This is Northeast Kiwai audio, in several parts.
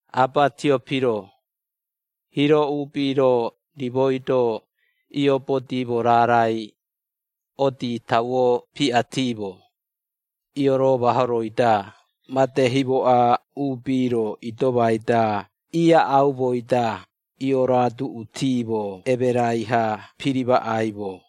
Aaba Tiopiro: Hiiro uubi-ro rimoi-do iiobodimo raarai, odii tauo piꞌatimo, ioromahoroi-da made himoꞌa uubi-ro idomai-da iaꞌaumoi-da ioroaduꞌutimo emerai-ha pirimaꞌaimo.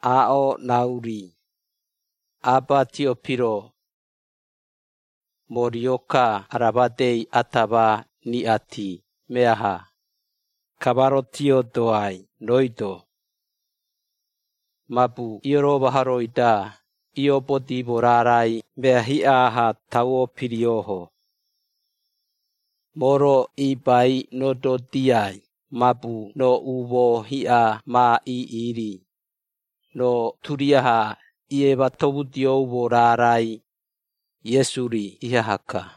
Aaꞌo rauri, Aaba Tiopiro, moo rio-ka ara madei ata ma riꞌati meaha, ka ma rotiodoai rooi-do, mabu ioromahoroi-da iiobodimo raarai mea hiꞌa-ha tauo piriooho. Moo-ro iibai rododiai mabu roo umoo hiꞌa ma iiꞌi-ri, roo turiaha iematomudioumo raarai, Iesu-ri ihaha-ka.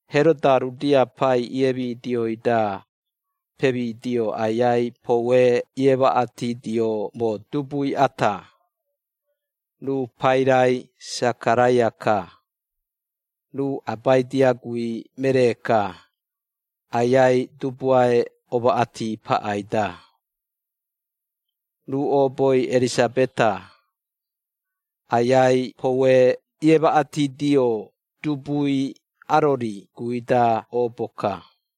Heroda Iudea Pai iemidioi-da, pemidio Aiai poue iemaꞌatidioumo dubui ata, ruu pairai Sakaraia-ka, ruu Abaidia guui meree-ka, Aiai Dubuae omaꞌati paꞌai-da. Ruu ooboi Erisabeta, Aiai poue iemaꞌatidio dubui, Arori guui-da oobo-ka.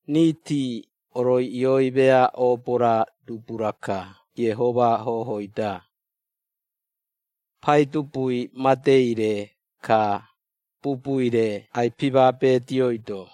Riiti oroiꞌioi mea oobo-ra dubu-raka Iehoma hohoi-da. Paidubui madei-re, ka Bubui-re ai-pimabedioido.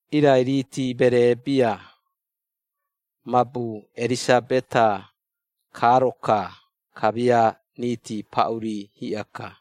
Irai riiti meree bia, mabu Erisabeta kaaro-ka, kamia riiti paꞌuri hiꞌa-ka.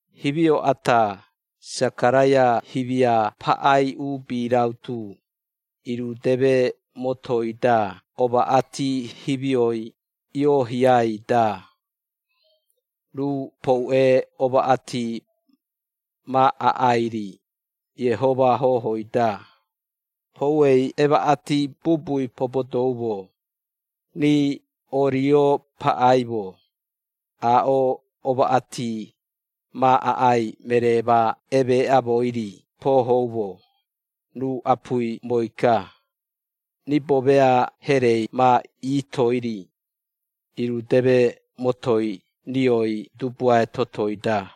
Himio ata, Sakaraia himia paꞌai uubi rautu irudeme motoi-da omaꞌati himioi ioohiai-da, ruu poue omaꞌati ma aꞌai-ri, Iehoma hohoi-da, pouei emaꞌati bubui pobodoumo, rii oorio paꞌaimo, aaꞌo omaꞌati ma aꞌai meree ma emeeꞌaumoi-ri poohoumo, ruu apuimoi-ka, ribo mea herei ma iitoi-ri, irudeme motoi rioi Dubuae totoi-da.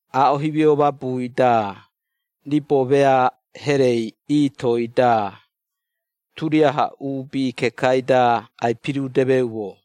Aaꞌo himio mabui-da, ribo mea herei iitoi-da, turiaha uubi kekai-da ai-pirudemeumo.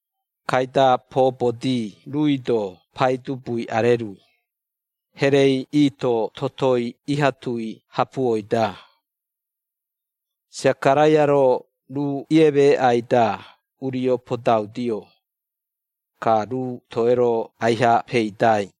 Kaida poobodi ruui-do Paidubui arerui, herei iito totoi iha tui hapuoi-da. Sakaraia-ro ruu iemeeꞌai-da urio podaudio, ka ruu toei-ro aiha peidai.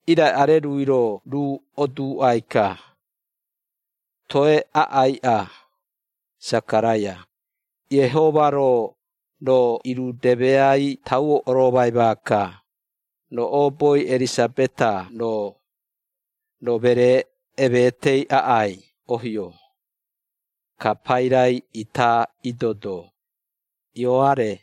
Irai arerui-ro ruu oduuꞌai-ka, “Toe aꞌaiꞌa, Sakaraia. Iehoma-ro, roo irudemeai tauo oromai maaka, roo ooboi Erisabeta-ro, roo meree emetei aꞌai ohio, ka pairai ita idodo, Ioare.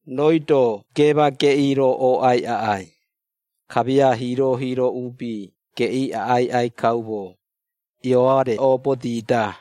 Rooi-do geema geꞌii-ro ooꞌai aꞌai, kamia hiiro-hiiro uubi geꞌii aꞌai aꞌai kaumo Ioare oobodi-da.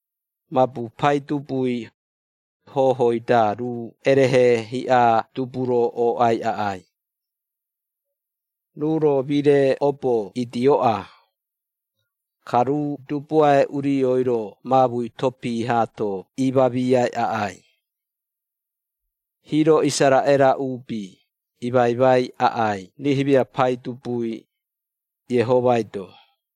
Mabu Paidubui, hohoi-da ruu erehe hiꞌa dubu-ro ooꞌai aꞌai. Ruu-ro mire obo idioꞌa. Ka ruu Dubuae Urioi-ro maamui topii haato imamiai aꞌai. Hiiro Isaraꞌera uubi imaimai aꞌai rii himia Paidubui, Iehomai-do.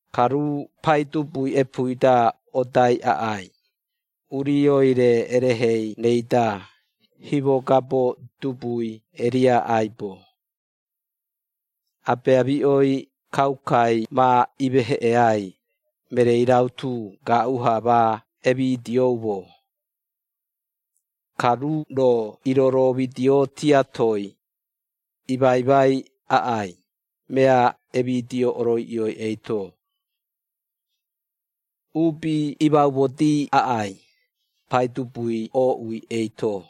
Ka ruu Paidubui epuui-da odai aꞌai, urioi-re erehei-reida, himogabo dubui Eria aibo. Abeamiꞌoi kaukai ma imeheꞌeai, mereei rautu gaaꞌu-ha ma emidioumo. Ka ruu-ro iroroomidio tiatoi, imaimai aꞌai, mea emidio oroiꞌioi eito. Uubi imaumodii aꞌai, Paidubui ooꞌui eito.”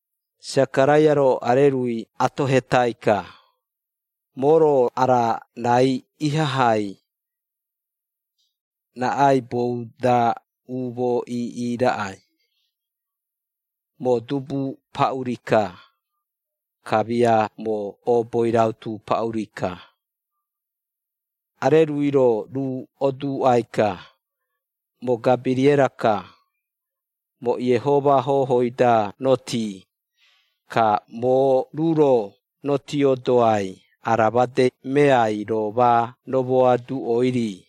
Sakaraia-ro arerui atohetai-ka, “Moo-ro ara raai ihahai, raꞌaibou-da umoo iiꞌi raꞌai? Moo dubu paꞌuri-ka, kamia moo ooboi rautu paꞌuri-ka.” Arerui-ro ruu oduuꞌai-ka, “Moo Gabiriera-ka. Moo Iehoma hohoi-da rotii, ka moo ruu-ro rotiodoai ara made meai roo ma romoaduꞌoi-ri.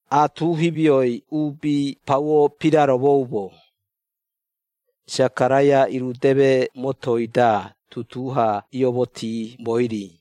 Aatu himioi uubi pauo piraromoumo, Sakaraia irudeme motoi-da tutuu-ha iomotiimoi-ri.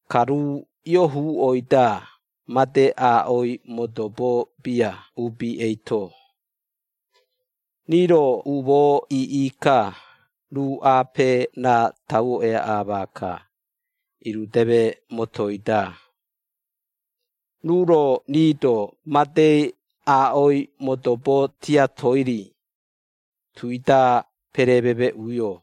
Ka ruu iohuuꞌoi-da, made aaꞌoi modobo bia uubi eito. Rii-ro umoo iiꞌi-ka, ruu aape raa tauo eaꞌa maaka, irudeme motoi-da. Ruu-ro rii-do madei aaꞌoi modobo tiatoi-ri, tui-da perememeꞌuio.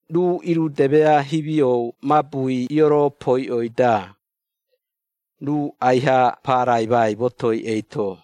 Ruu iirudemea himio mabui ioropoiꞌoi-da, ruu aiha paraimai motoi eito.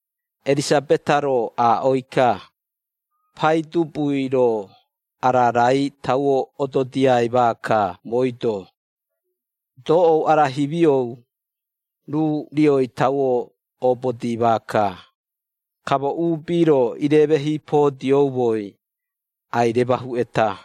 Erisabeta-ro aaꞌoi-ka, “Paidubui-ro ara raai tauo ododiai maaka mooi-do. Doꞌou ara himiou, ruu rioi tauo obodii maaka, ka moo uubi-ro ireemehiipodioumoi, ai-remahuꞌeta.”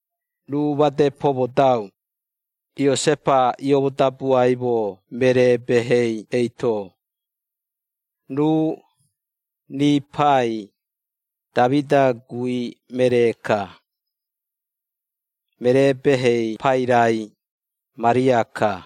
Ruu made pomodau, Iosepa iomodabuaimo meree-behei eito. Ruu, rii Pai, Damida guui meree-ka. Meree-behei pairai, Maria-ka.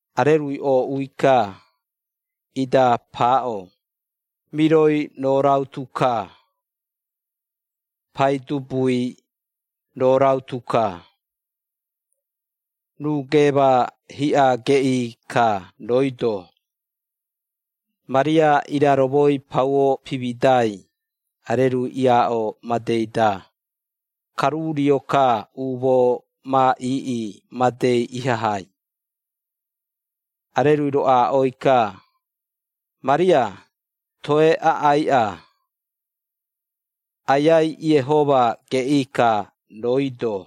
Arerui ooꞌui-ka, ida paaꞌo, “Miroi roo rautu-ka! Paidubui, roo rautu-ka. Ruu geema hiꞌa geꞌii-ka rooi-do.” Maria iraromoi pauo pimidai arerui iaaꞌo madei-da, ka ruu rio-ka umoo ma iiꞌi madei ihahai. Arerui-ro aaꞌoi-ka, “Maria, toe aꞌaiꞌa. Aiai Iehoma geꞌii-ka rooi-do.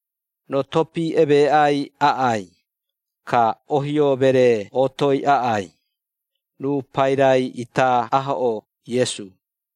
Roo topii emeeꞌai aꞌai, ka ohio-meree ootoi aꞌai, ruu pairai ita ahoꞌoo, Iesu.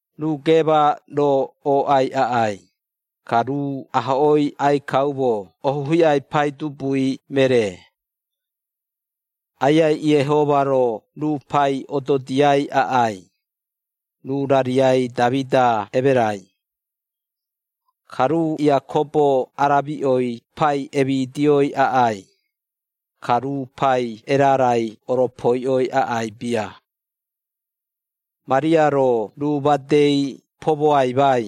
Ruu geema-ro ooꞌai aꞌai, ka ruu ahoꞌoi aꞌai kaumo ohu hiꞌai Paidubui Meree. Aiai Iehoma-ro ruu Pai ododiai aꞌai, ruu rariai Damida emerai. Ka ruu Iakobo aramiꞌoi Pai emidioi aꞌai, ka ruu Pai erarai oropoiꞌoi aꞌai bia.” Maria-ro ruu madei pomoaimai,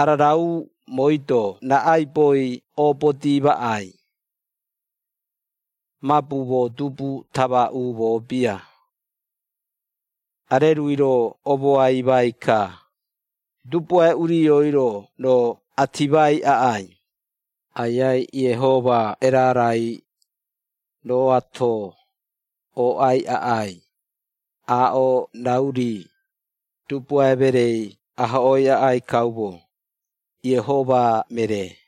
“Ararau mooi-do raꞌaibou oobodi maꞌai? Mabu moo dubu tama umoo bia.” Arerui-ro omoaimai-ka, “Dubuae Urioi-ro roo atimai aꞌai, Aiai Iehoma erarai, rooato, ooꞌai aꞌai, aaꞌo rau-ri, Dubuae mereei ahoꞌoi aꞌai kaumo, Iehoma meree.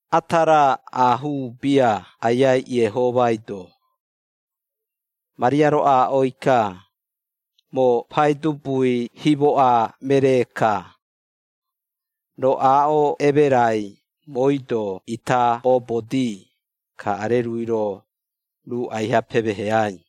Ata raa aahuu bia Aiai Iehomai-do.” Maria-ro aaꞌoi-ka, “Moo Paidubui himoꞌa meree-ka. Roo aaꞌo emerai mooi-do ita oobodi.” Ka arerui-ro, ruu aiha pemeheai.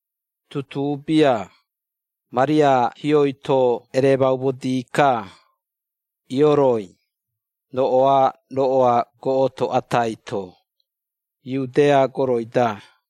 Tutuu bia, Maria hioi-to eremaumodi-ka, ioroi, roꞌoa-roꞌoa goꞌoto atai-to, Iudea goroi-da.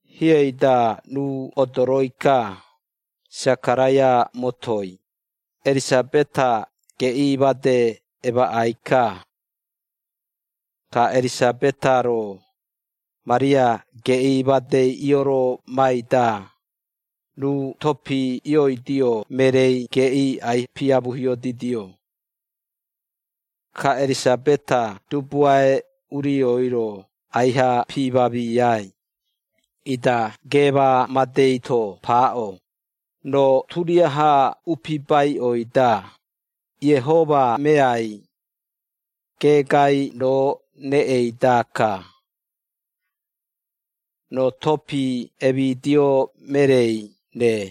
Hiei-da ruu odoroi-ka, Sakaraia motoi, Erisabeta geꞌii made emaꞌai-ka. Ka Erisabeta-ro, Maria geꞌii madei ioromai-da, ruu topii ioidio mereei geꞌii ai-piamuhiodidio. Ka Erisabeta Dubuae Urioi-ro aiha piimamiai, ida geema madei-to paaꞌo, “Roo turiaha upibaiꞌoi-da, Iehoma meai, geegai roo reꞌei-daka, roo topii emidio mereei-re.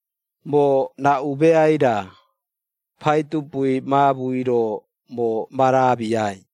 Moo raꞌu meai-ra, Paidubui maamui-ro moo ma raamiai?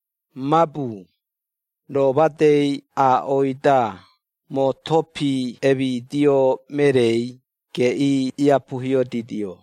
Mabu, roo madei aaꞌoi-da moo topii emidio mereei geꞌii iapuhiodidio.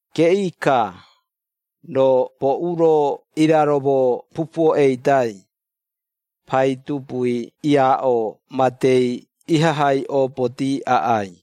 Geꞌii-ka, roo boꞌu-ro iraromo pupuo eidai, Paidubui iaaꞌo madei ihahai oobodi aꞌai.”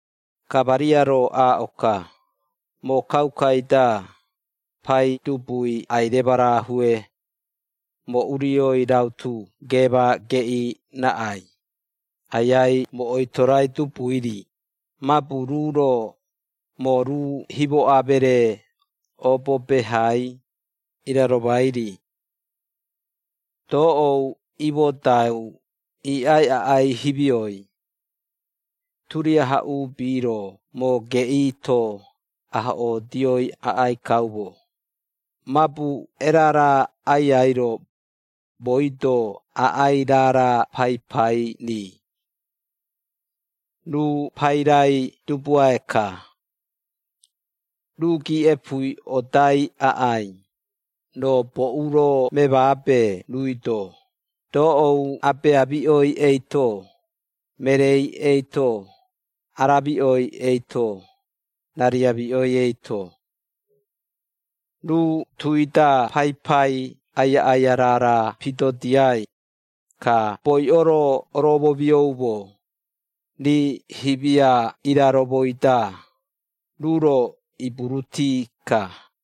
Ka Maria-ro aaꞌo-ka, “Moo kaukaui-da, Paidubui ai-remarahue; Moo urioi rautu geema geꞌii raꞌai, Aiai moo oitorai Dubui-ri, mabu ruu-ro, moo ruu himoꞌa meree, oobo behai, iraromai-ri. Doꞌou imodau iiꞌai aꞌai himioi, turiaha uubi-ro moo geꞌii-to ahoꞌoodioi aꞌai kaumo, mabu Erara Aiai-ro, mooi-do aꞌai raara paipai-ri. Ruu pairai Dubuae-ka. Ruu giiꞌepui odai aꞌai, roo boꞌu-ro memaabe ruui-do, doꞌou abeamiꞌoi eito, mereei eito, aramiꞌoi eito, rariamiꞌoi eito. Ruu tui-da paipai aiaꞌaia raara pidodiai, ka boiꞌo-ro oroomomioumo, rii himia iraromoi-da, ruu-ro iburuti-ka.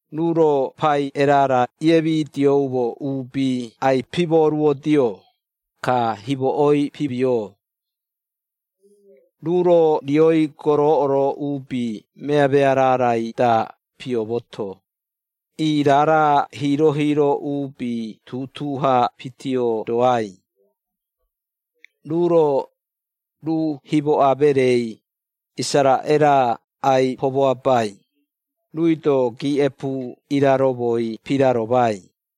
Ruu-ro pai erara iemidioumo uubi ai-pimooruodio, ka himoꞌoi pimioo. Ruu-ro rioi goroꞌoro uubi meamea raarai-da piomoto, ii raara hiiro-hiiro uubi tutuu-ha pitiodoai. Ruu-ro, ruu himoꞌa mereei, Isaraꞌera ai-pomoaabai, ruui-do giiꞌepu iraromoi piraromai,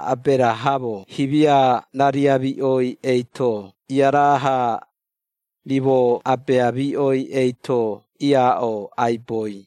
Aberahamo himia rariamiꞌoi eito iaraa-ha, rimo abeamiꞌoi eito iaaꞌo aiboi.”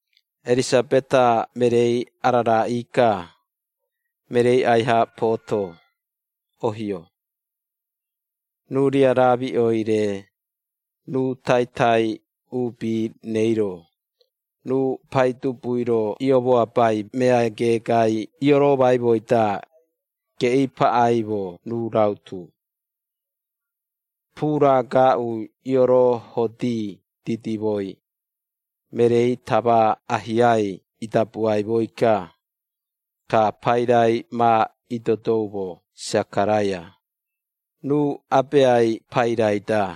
Erisabeta mereei araraꞌii-ka, mereei aiha pooto, ohio. Ruu riaraamiꞌoi-re, ruu taitai uubi-reiro, ruu Paidubui-ro iomoaabai mea geegai ioroomaimoi-da, geꞌii paꞌaimo ruu rautu. Puura gaaꞌui ioroohodi didimoi, mereei tama ahiai idabuaimoi-ka, ka pairai ma idodoumo Sakaraia, ruu abeai pairai-da.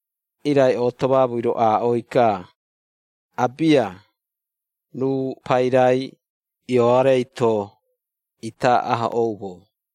Irai ooto maamui-ro aaꞌoi-ka, “Abia, ruu pairai, Ioarei-to, ita ahoꞌoumo.”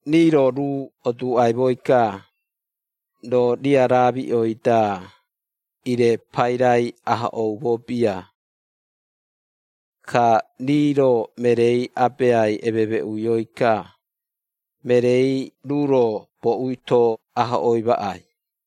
Rii-ro ruu oduuꞌaimoi-ka, “Roo riaraamiꞌoi-da, iire pairai ahoꞌoumo bia.” Ka rii-ro mereei abeai ememeꞌuioi-ka, mereei ruu-ro boꞌui-to ahoꞌoi maꞌai.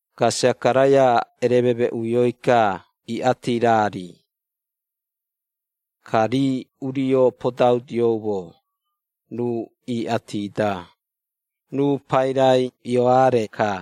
Ka Sakaraia erememeꞌuioi-ka iꞌati raa-ri. Ka rii urio podaudioumo ruu iꞌati-da, “Ruu pairai Ioare-ka.”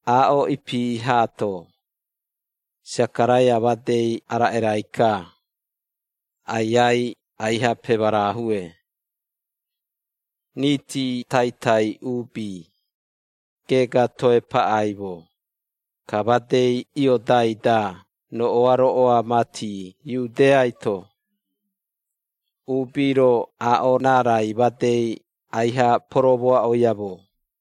Aaꞌo ipi haato, Sakaraia madei araꞌerai-ka, Aiai aiha pemarahue. Riiti taitai uubi, geega toe paꞌaimo, ka madei iodai-da roꞌoa-roꞌoa mati Iudeaito, uubi-ro aaꞌo raarai madei aiha poromoaꞌoiamo.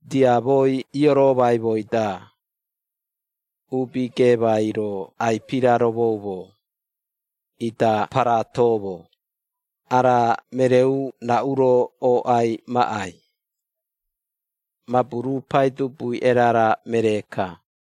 Diamoi ioroomaimoi-da, uubi geemai-ro ai-piraromoumo, ida paraatomo, “Ara mereeu raꞌu-ro ooꞌai maꞌai?” Mabu ruu Paidubui erara meree-ka.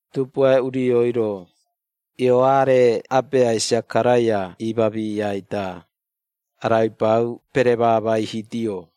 Dubuae Urioi-ro, Ioare abeai Sakaraia iimamiai-da, araibau peremamaihidio: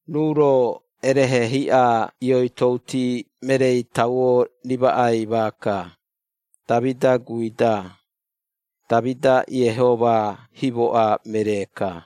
Ruu-ro erehe hiꞌa ioitouti mereei tauo rimaꞌai maaka, Damida guui-da, Damida Iehoma himoꞌa meree-ka.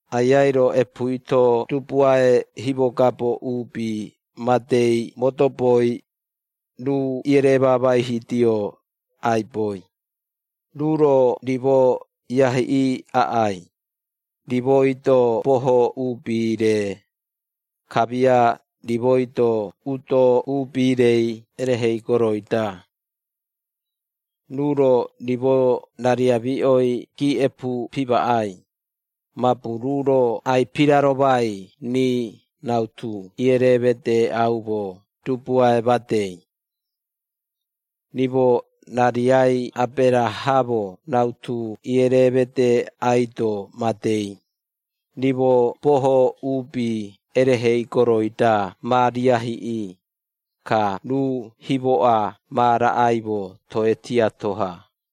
Aiai-ro epuui-to dubuae himogabo uubi madei modoboi, ruu iereemamaihidio aiboi, ruu-ro rimo iahiꞌii aꞌai, rimoi-do boho uubi-re, kamia rimoi-do udo uubi-rei erehei goroi-da. Ruu-ro rimo rariamiꞌoi giiꞌepu pimaꞌai, mabu ruu-ro ai-piraromai rii rautu iereemedeeꞌaumo Dubuae madei. Rimo rariai Aberahamo rautu iereemedeeꞌaido madei, rimo boho uubi erehei goroi-da ma riahiꞌii, ka ruu himoꞌa ma raꞌaimo toe tiato-ha.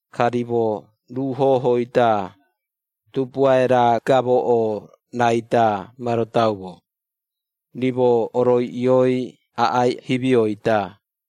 Ka rimo ruu hohoi-da, dubuae-ra gamoꞌo-raida ma rodaumo, rimo oroiꞌioi aꞌai himioi-da.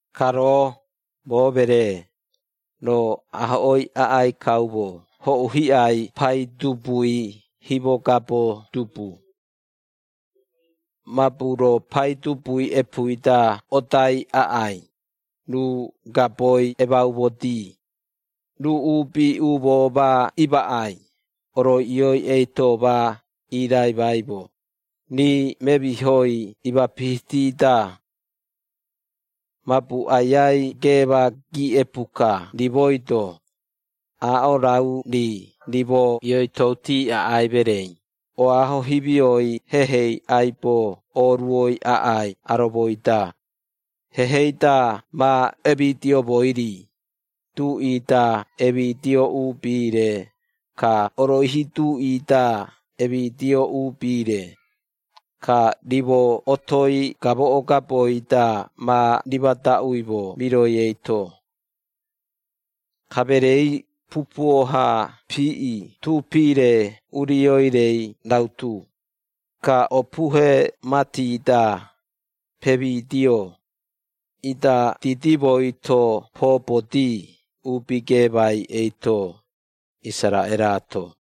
Ka roo, moo meree, roo ahoꞌoi aꞌai kaumo hoꞌu hiꞌai Paidubui himogabo dubu. Mabu roo Paidubui epuui-da odai aꞌai, ruu gaboi emaumodi, ruu uubi umoo ma imaꞌai, oroiꞌioi eito ma iiraimaimo, rii memihoi imapihiti-da. Mabu Aiai geema giiꞌepu-ka rimoi-do, aaꞌo rau-ri rimo ioitouti aꞌai mereei oaho himioi hehei aibo oruoi aꞌai aromoi-da, hehei-da ma emidioumoi-ri, duꞌi-da emidio uubi-re, ka oroihi duꞌi-da emidio uubi-re, ka rimo otoi gamoꞌo gaboi-da ma rimadaꞌuimo miroi eito.” Ka mereei pupuo-ha piiꞌi tuupi-re urioi-rei rautu, ka opuhe mati-da pemidio, ida didimoi-to poobodi uubi geemai eito, Isaraꞌeraato.